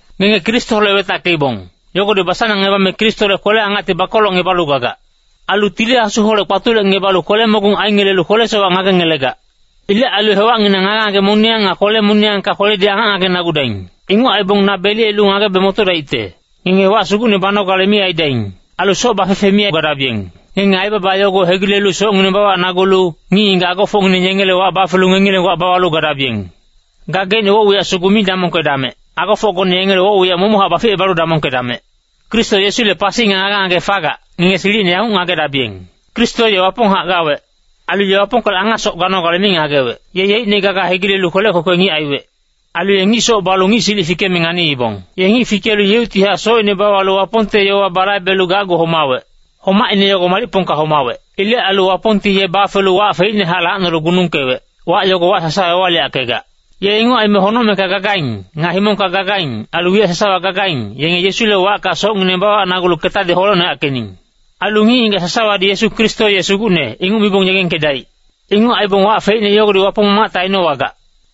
Ngenge Kristoholec wetackeibong, yogodi basanangngebame Kristole kwele-angacti bakolocngebalu gagac. Ailu Tili Asuholec kpatulecngebalu kwele-mogung aingelelu kwele-sowac ngagengelegac. Ilec ailu hewacnginang ngage-ngage moniyang nga kwele-moniyangka kweledi angac ngagenagudaing. Inguc aibong na beliyelu ngagebe motodaicte. Ngenge wac sugucne banogale mi aidaing. Ailu soc bafefe mi gadabiyeng. Ngenge aibaba yogo hegilelu socngineng bawacnagulu, ngic-ngigac agofocngineng yengele wac bafelu ngengileng wac bawalu gadabiyeng. Gageicne woc-wiyac sugu mi damongkedamec, agofocgone yengele woc-wiyac momochac baficebalu damongkedamec. Kristo Yesule pasi nga ngage-ngage fagac, ngenge silicine yanguc ngagedabiyeng. Kristo ye Waponghac gawec. Ailu ye Wapongkolec angasoc ganogale mi ngagewec. Ye yeicne gaga hegilelu kwelec kwekwe ngic aiwec. Ailu ye ngic soc balu ngic silic fikeme nganiibong. Ye ngic fikelu yeuctihac socine bawalu Wapongte yowa balaibelu gacgu homawec. Homacine yogo malicpongka homawec. Ilec ailu Wapongti ye bafelu wac feicnehac lacnolu gunungkewec, wac yogo wac sasawa ewaliyackegac. Ye inguc aime honocmengka gagaing, nga himongka gagaing, ailu wiyac sasawa gagaing, yenge Yesule wacka socngineng bawacnagulu ketadi holecnoyackening. Ailu ngic-ngigac sasawadi Yesu Kristo ye Sugucne, inguc mibong yegengkedaic. Inguc aibong wac feicne yogodi Wapong Mamacte ainowagac.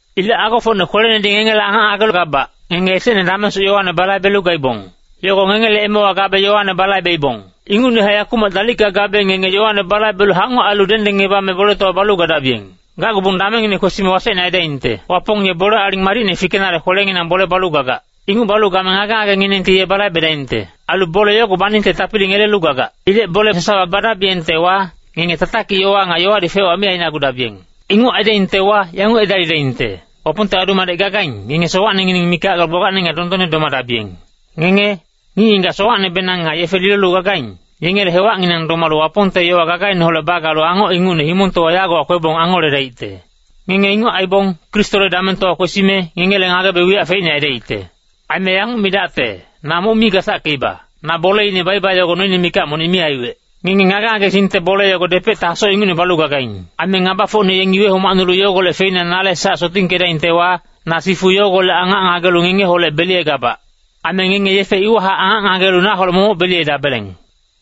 Ilec agofocne kwelenedi ngengele angac ngagegabac, ngenge esecne damengsoc yowane balaibelu gaibong. Yogo ngengele emewa gabe yowane balaibeibong. Ingucnehac yakumac dalicka gabe ngenge yowane balaibelu hangoc ailu dengdengngebame boletowa balu gadabiyeng. Gacgubong damengngine kwesime wasecne aidaingte. Wapong ye bole aling madicne fikenale kwelenginang bole balu gagac. Inguc balu game ngage-ngagenginengti ye balaibedaingte. Ailu bole yogo baningte tapili ngelelu gagac. Ilec bole sasawa badabiyengtewa, ngenge tatakic yowa nga yowadi fec-wac mi ainagudabiyeng. Inguc aidaingtewa, yanguc edalidaingte, Wapongte adu-madec gagaing, ngenge sowacnengineng mikac galu gbagbacne nga dondonne domadabiyeng. Ngenge, ngic-ngigac sowacnebenang nga yefe lilolu gagaing, yengele hewacnginang domalu Wapongte yowa gagaineholec bagalu angoc ingucne himongtowa yagowa kwebong angoledaicte. Ngenge inguc aibong, Kristole damengtowa kwesime, ngengele ngagebe wiyac feicne aidaicte. Aime yanguc midacte, na moc mi gasackeiba, me bolene baiba yogo noine mikac monic mi aiwec. Ngenge ngage-ngagesingte bole yogo depecte hasoc ingucne balu gagaing. Aime ngabafocne yengi wehomacnulu yogolec feina nale sac sotingkedaingtewa, na sifu yogolec angac ngagelu ngengeholec beliyegabac. Aime ngenge yefe iwahac angac ngagelu naholec momoc beliyedabeleng.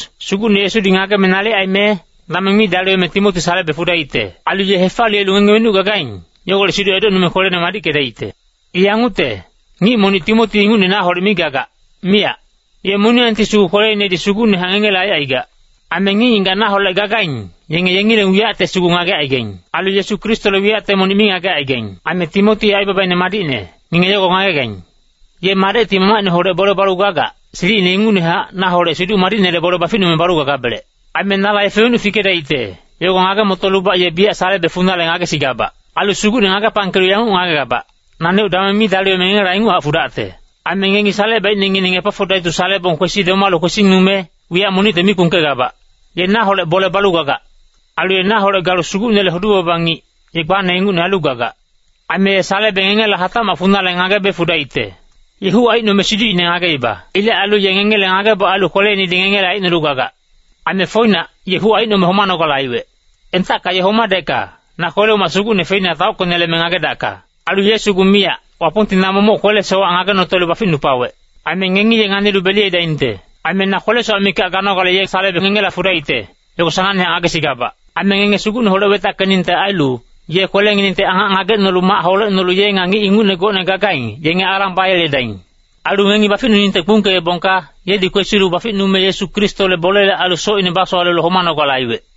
Sugucne Yesudi ngageme nalic aime, dameng mi daliweme Timoti salebe fudaicte. Ailu ye hefaliyelu ngenge wenuc gagaing, yogolec siduc edocnume kwelene madickedaicte. I yangucte, ngic monic Timoti ingucne naholec mi gagac, miyac. Ye moniyangti sugu kweleinedi sugucnehac ngengele aicaigac. Aime ngic-ngigac naholec gagaing, yenge yengileng wiyacte sugu ngagecaigaing. Ailu Yesu Kristole wiyacte monic mi ngagecaigaing. Aime Timoti ye aibabaine madicne, ngenge yogo ngagegaing. Ye madecti mamacineholec bole balu gagac, silicine ingucnehac, naholec Siduc Madicnele bole baficnume balu gagabelec. Aime nala yefe wenuc fikedaicte, yogo ngage-motolubac ye biyac salebe funale ngagesigabac. Ailu Sugucne ngagepangkelu yanguc ngagegabac, naneuc dameng mi daliweme ngengela inguchac fudacte. Aime ngengi salecebaicnengineng Epafodaitus salebong kwesi domalu kwesingnume, wiyac monicte mi kpungkegabac. Ye naholec bole balu gagac. Ailu naholec galu Sugucnele hudu-baba ngic, ye gbane ingucne ailu gagac. Aime ye salebe ngengela hatacmac funale ngagebe fudaicte. Ye huc aicnome siducine ngageibong. Ilec ailu ye ngengele ngageboc ailu kweleinedi ngengele aicnolu gagac. Aime foinac, ye huc aicnome homanogale aiwec. Entacka ye homadecka, na kwele-umac sugucne feina taockeneleme ngagedacka. Ailu ye sugu miyac, Wapongti na momoc kwele-sowac ngagenotelu baficnupawec. Aime ngengi ye nganilu beliyedaingte. Aime na kwele-sowac mikac ganogale ye salebe ngengela fudaicte, yogo sanangnehac ngagesigabac. Aime ngenge Sugucneholec wetackeningte ailu, ye kwelenginengti angac ngagecnolu mac holecnolu ye nga ngic ingucne gocne gagaing, yenge alang bayeledaing. Ailu ngengi baficnuningte kpungkeebongka, yedi kwesilu baficnume Yesu Kristole bolele ailu socine basowalelu homanogale aiwec.